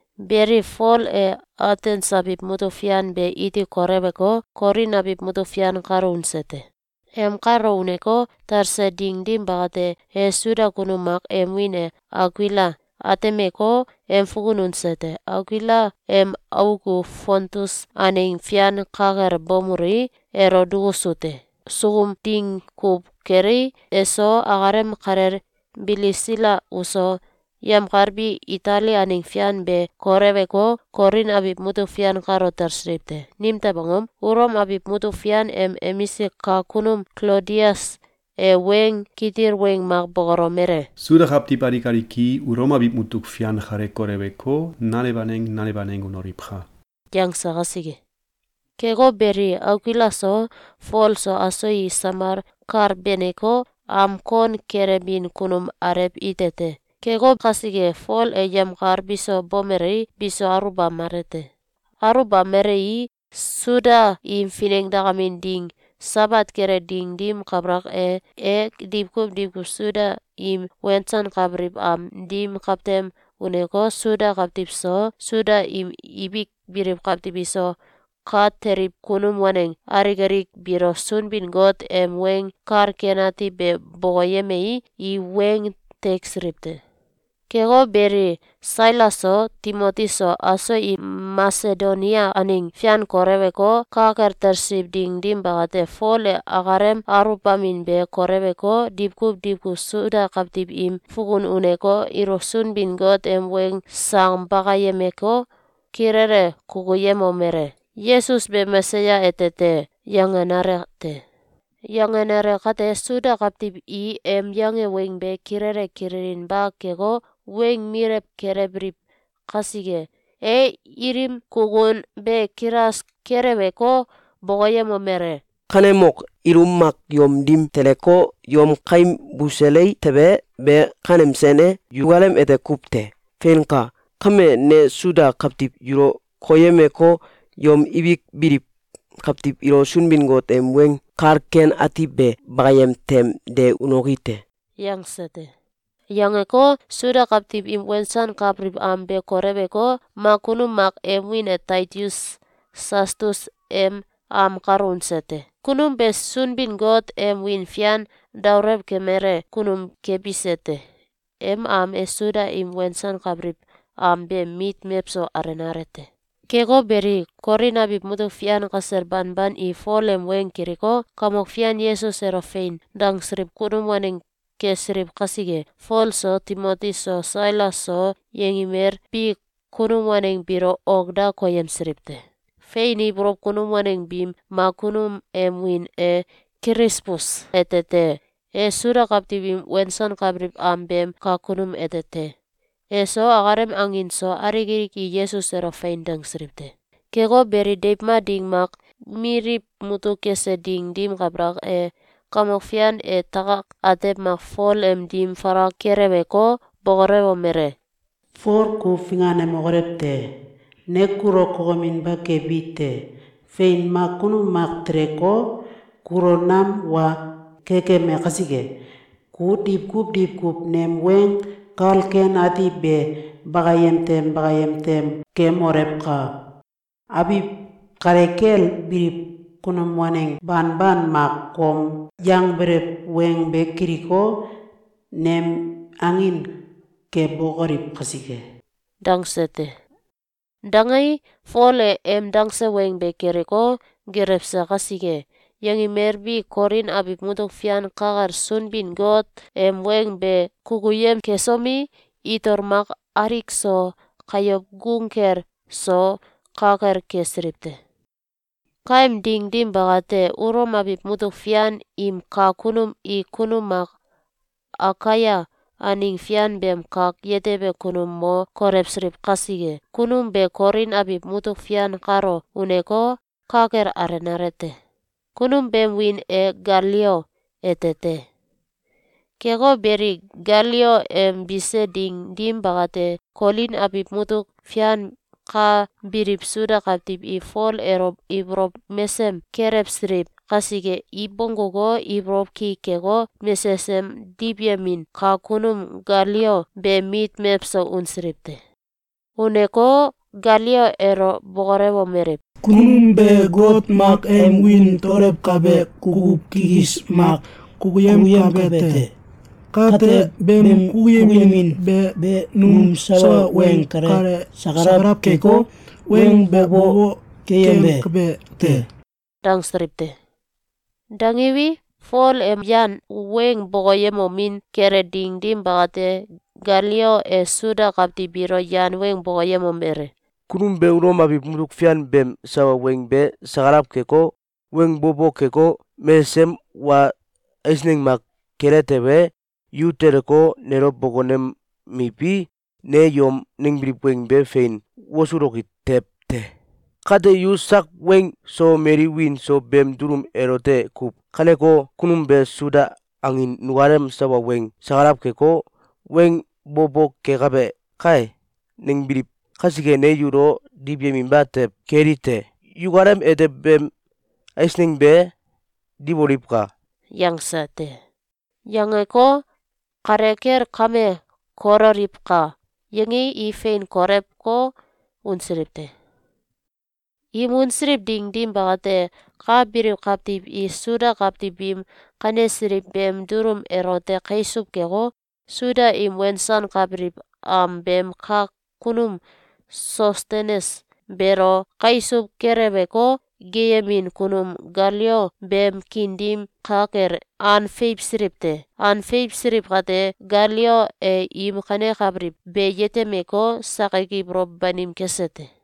Beli, Fol e Atens abiw mutuk fian be iti koleweko, Kolin abiw mutuk fian kalo unse te. Em kalo uneko, talse ding dim bakate, e Suda kunum mak em wiin e Akuila atemeko, em fukun unse te. Akuila em auk u Fontus aneng fian ka kel bomelui, elo dukusu te. Sukum ding kuw kelei, eso, akalem kalel Bilisila uso, yemkal bi Itali aneng fian be koleweko, Kolin abiw mutuk fian kalo talsiliw te. Nimtew angom? Ulom abiw mutuk fian em emisik kak kunum Klodius e weng kitil weng mak bokolomele: “Suda kawtiw alik alik i Ulom abiw mutuk fian kale koleweko, nanew aneng nanew aneng unoliwka!”, yangse kasike. Keko beli, Akuila so, Fol so, aso i samal kal beneko, am kon kelebin kunum alew ite te. Keko kasike, Fol e yemkal biso bomelei, biso aluwbamele te. Aluwbamelei, Suda im finengdakamin ding Sabat kele ding dim kabalak e, e diwkuw diwkuw Suda im wensankabiliw am dim kawtem uneko, Suda kawtiw so, Suda im ibik biliw kawtiw iso, ka teliw kunum waneng alik alik biilo Sunbin-Got em Weng Kal Ken Ati be bokoyemei, i weng teksiliw te. Keko beli, Sailas so, Timoti so, aso im Masedonia aneng fian koleweko, ka kel talsiliw ding dim bakate, Fol e akalem aluwbamin be koleweko, diwkuw diwkuw Suda kawtiw im fukun uneko, ilo Sunbin-Got em weng sang bakayemeko, kilele kukuyemomele: “Yesus be Mesaya ete te!”, yangenale te. Yangenale kate, Suda kawtiw i em yange weng be kilele kililinba keko, weng milew kelewbiliw kasike, e ilim kukun be kilas keleweko, bokoyemomele: “Kanemok! Ilum mak yom dim teleko, yom kaim busele tewe, be kanem sen e? Yukalem ete kuw te. Feinka! Kame ne Suda kawtiw yulo koyemeko, yom ibik biliw kawtiw ilo Sunbin-Got em Weng Kal Ken Ati be bakayem tem de unoki te!”, yangse te. Yangeko, Suda kawtiw im wensankabiliw am be koleweko, mak kunum mak em wiin e Titius Sastus em am kalo unse te. Kunum be Sunbin-Got em wiin fian daolew kemele kunum kebise te. Em am e Suda im wensankabiliw am beem mit mewso alenale te. Keko beli, Kolin abiw mutuk fian kasel banban i Fol em weng kiliko, Kamok Fian Yesus elo “Fein!”, dangsiliw kunum waneng kesiliw kasike, Fol so, Timoti so, Sailas so, yengimel bi kunum waneng biilo ok da koyemsiliw te. Fein ibolow kunum waneng biim mak kunum em wiin e Kilisbus ete te. E Suda kawtiw im wensankabiliw am beem kak kunum ete te. Eso, akalem angin so, alik alik i Yesus elo “Fein!”, dangsiliw te. Keko beli, deiw mak ding mak, miliw mutuk kese ding dim kabalak e, Kamok Fian e takak atew mak Fol em dim falak keleweko, bokolewomele: “Fol, ku finganemokolew te! Ne kulo kokeminba kebi te. Fein! Mak kunum mak teleko, kulo nam wa kekeme kasike, ku diwkuw diwkuw nem Weng Kal Ken Ati be bakayem tem bakayem tem kemolewka! Abiw kale kel biliw kunum waneng banban mak kom yangbelew weng be kiliko, nem angin kebokoliw kasike.”, dangse te. Dangei, Fol e em dangse weng be kiliko, gelewse kasike, yangimel bi Kolin abiw mutuk fian ka kel Sunbin-Got em weng be kukuyem kesomi, itol mak alik so, kayow gung kel so, ka kel kesiliw te. Kaem ding dim bakate, Ulom abiw mutuk fian im kak kunum i kunum mak Akaia aneng fian beem kak yetebe kunum mo kolewsiliw kasike, kunum be Kolin abiw mutuk fian kalo uneko, ka kel alenale te. Kunum beem wiin e Galio ete te. Keko beli, Galio em bise ding dim bakate, Kolin abiw mutuk fian ka biliw Suda kawtiw i Fol elo ibolow mesem kelewsiliw kasike, i bongguko, ibolow ki keko, mesesem diwyemin kak kunum Galio beem mit mewso unsiliw te. Uneko, Galio elo bokolewomeliw: “Kunum be got mak em wiin daolewkabe kukuw kikis mak kukuyemkabe te. Kate, beem kukuyemin be num sawa weng kale sakalaw keko, weng bo bo keyembe te.”, dangsiliw te. Dangiwi, Fol em yan weng bokoyemomin kele ding dim bakate, Galio e Suda kawtiw biilo yan weng bokoyemomele: “Kunum be Ulom abiw mutuk fian beem sawa weng be sakalaw keko, weng bo bo keko, mesesem wa eisneng mak kele tewe, yu teleko, nelo bokonemiwi, ne yom nangbiliw weng be fein wosuloki tew te. Kate, yu sak weng so, mali wiin so, beem dulum elote kuw ganeko, ‘Kunum be Suda angin nukalem sawa weng sakalaw keko, weng bo bo kekabe kae!’, nangbiliw kasike, ne yulo diwyeminba tew keli te. Yukalem ete beem eisneng be diwoliwka!”, yangse te. Yangeko, ‘Kale kel kame kololiwka!’, yangei, i fein kolewko, unsiliw te. Im unsiliw ding dim bakate, ka biliw kawtiw i Suda kawtiw biim kanesiliw beem dulum elote kaisuw keko, Suda im wensankabiliw am beem kak kunum Sostenes beelo kaisuw keleweko, geeyemin kunum Galio beem kiin dim ka kel an feiwsiliw te. An feiwsiliw kate, Galio e im kanekabiliw be yetemeko, sakik ibolow banim kese te.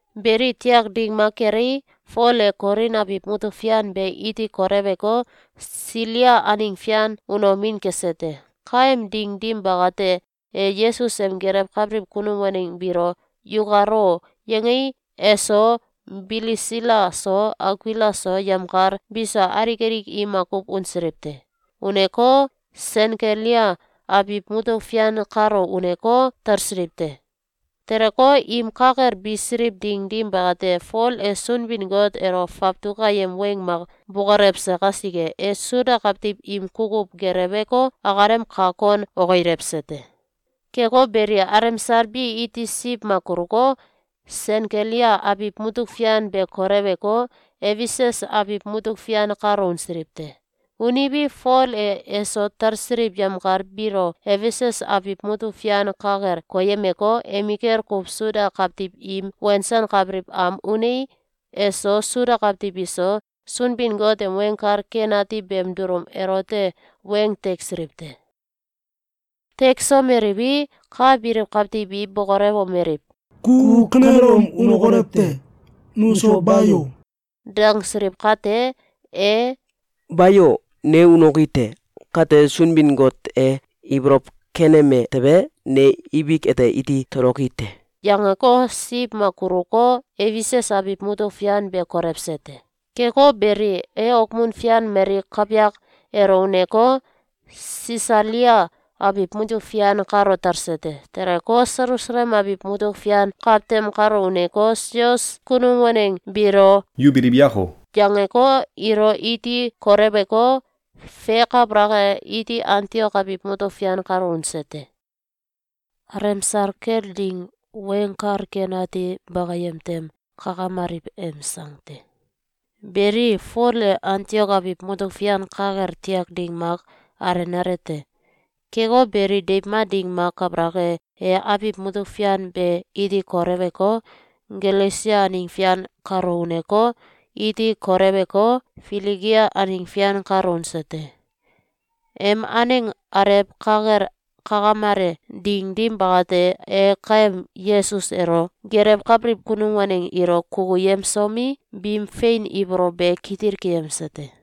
Beli, tiak ding mak kelei, Fol e Kolin abiw mutuk fian be iti koleweko, Silia aneng fian unomin kese te. Kaem ding dim bakate, e Yesus em gelewkabiliw kunum waneng biilo “Yukal o!”, yangei, eso, Bilisila so, Akuila so, yemkal biso, alik alik i makuw unsiliw te. Uneko, Senkelia abiw mutuk fian kalo uneko, talsiliw te. Teleko, im ka kel bisiliw ding dim bakate, Fol e Sunbin-Got elo fawtuk ayem weng mak bokolewse kasike, e Suda kawtiw im kukuw geleweko, akalem kak kon okilewse te. Keko beli, alemsal bi iti siw mak kuluko, Senkelia abiw mutuk fian be koleweko, Efesus abiw mutuk fian kalo unsilw te. Uniwi, Fol e eso talsiliw yemkal biilo Efesus abiw mutuk fian ka kel koyemeko, emikel kuw Suda kawtiw im wensankabiliw am unei, eso, Suda kawtiw iso, Sunbin-Got em Weng Kal Ken Ati beem dulum elote weng teksiliw te. Teksomeliwi, ka biliw kawtiw bi bokolewomeliw: “Ku kanelom unokolew te! Nuso ba yo!”, dangsiliw kate, e “Bayo! Ne unoki te! Kate, Sunbin-Got e ibolow keneme tewe, ne ibik ete iti toloki te!”, yangeko, siw mak kuluko, Efesus abiw mutuk fian be kolewse te. Keko beli, e okmun fian mali kawyak elo uneko, Sisalia abiw mutuk fian kalo talse te. Teleko, Selusalem abiw mutuk fian kawtem kalo uneko, sois kunum waneng biilo “Yu biliw yako!”, yangeko, ilo iti koleweko, fe kabalak e, iti Antiok abiw mutuk fian kalo unse te. Alemsal kel Ding Weng Kal Ken Ati Bakayem Tem Kakamaliw em Sang te. Beli, Fol e Antiok abiw mutuk fian ka kel tiak ding mak alenale te. Keko beli, deiw mak ding mak kabalak e, e abiw mutuk fian be iti koleweko, Galesia aneng fian kalo uneko, iti koleweko, Filigia aneng fian kalo unse te. Em aneng alew ka kel kakamele ding dim bakate, e kaem Yesus elo gelewkabiliw kunum waneng ilo kukuyemsomi, biim fein ibolow be kitil keyemse te.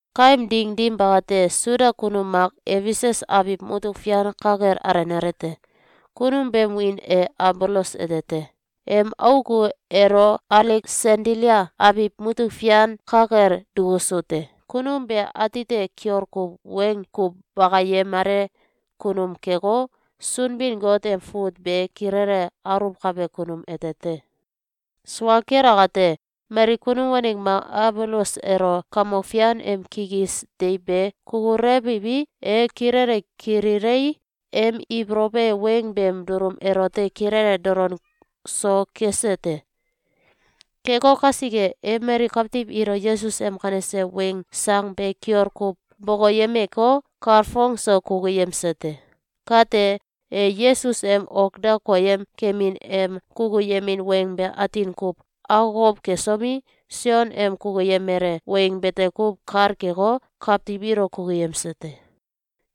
Kaem ding dim bakate, Suda kunum mak Efesus abiw mutuk fian ka kel alenale te. Kunum beem wiin e Abolos ete te. Em auk u elo Aleksandilia abiw mutuk fian ka kel dukusu te. Kunum be atite kiol kuw weng kuw bakayemale kunum keko, Sunbin-Got em fut be kilele aluwkabe kunum ete te. Sua kel akate, mali kunum waneng mak Abolos elo Kamok Fian em kikis deiw be kukulewiwi, e kilele kililei, em ibolow e weng beem dulum elote kilele dolon so kese te. Keko kasike, e mali kawtiw ilo Yesus em kanese weng sang be kiol kuw bokoyemeko, kalfong so kukuyemse te. Kate, e Yesus em ok da koyem kemin em kukuyemin weng be atin kuw akokow kesomi, Sion em kukuyemele weng bete kuw kal keko, kawtiw ilo kukuyemse te.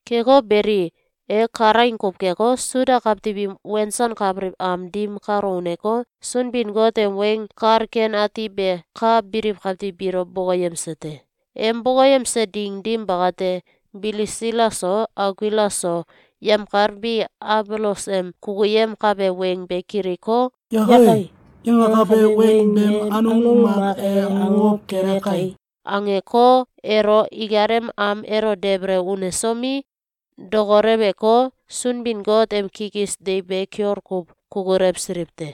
Keko beli, e kalaing kuw keko, Suda kawtiw im wensankabiliw am dim kalo uneko, Sunbin-Got em Weng Kal Ken Ati be ka biliw kawtiw biilo bokoyemse te. Em bokoyemse ding dim bakate, Bilisila so, Akuila so, yemkal bi Abolos em kukuyemkabe weng be kiliko, “Yakai! Yangakabe weng beem anung mak e akokow kele kai!”, angeko, elo ikalem am elo debele unesomi, dokoleweko, Sunbin-Got em kikis deiw be kiol kuw kukulewsiliw te.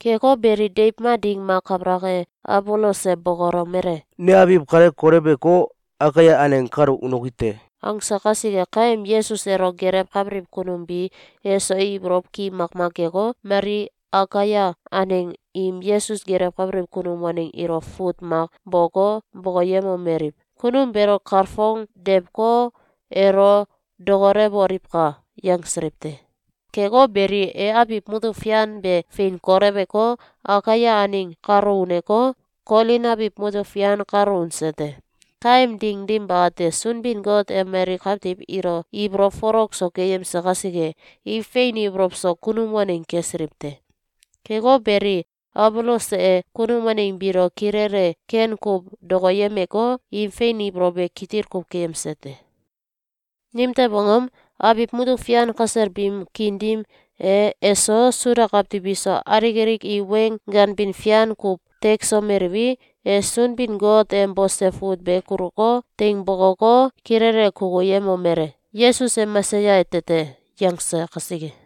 Keko beli, deiw mak ding mak kabalak e, Abolos e bokolomele: “Ne abiw kale koleweko, Akaia aneng kalo unoki te!”, angse kasike, kaem Yesus elo gelewkabiliw kunum bi eso ibolow ki makmak keko, mali Akaia aneng im Yesus gelewkabiliw kunum waneng ilo fut mak boko, bokoyemomeliw: “Kunum beelo kalfongdewko, elo dokolewoliwka!”, yangsiliw te. Keko beli, e abiw mutuk fian be fein koleweko, Akaia aneng kalo uneko, Kolin abiw mutuk fian kalo unse te. Kaem ding dim bakate, Sunbin-Got e mali kawtiw ilo ibolow folok so keyemse kasike, i fein ibolow so kunum waneng kesiliw te. Keko beli, Abolos e kunum waneng biilo kilele ken kuw dokoyemeko, im fein ibolow be kitil kuw keyemse te. Nimtew angom? Abiw mutuk fian kasel biim kiin dim e, eso, Suda kawtiw iso, alik alik i weng ganbin fian kuw teksomeliwi, e Sunbin-Got em bose fut be kuluko, teing bokoko, kilele kukuyemomele: “Yesus e Mesaya ete te!”, yangse kasike.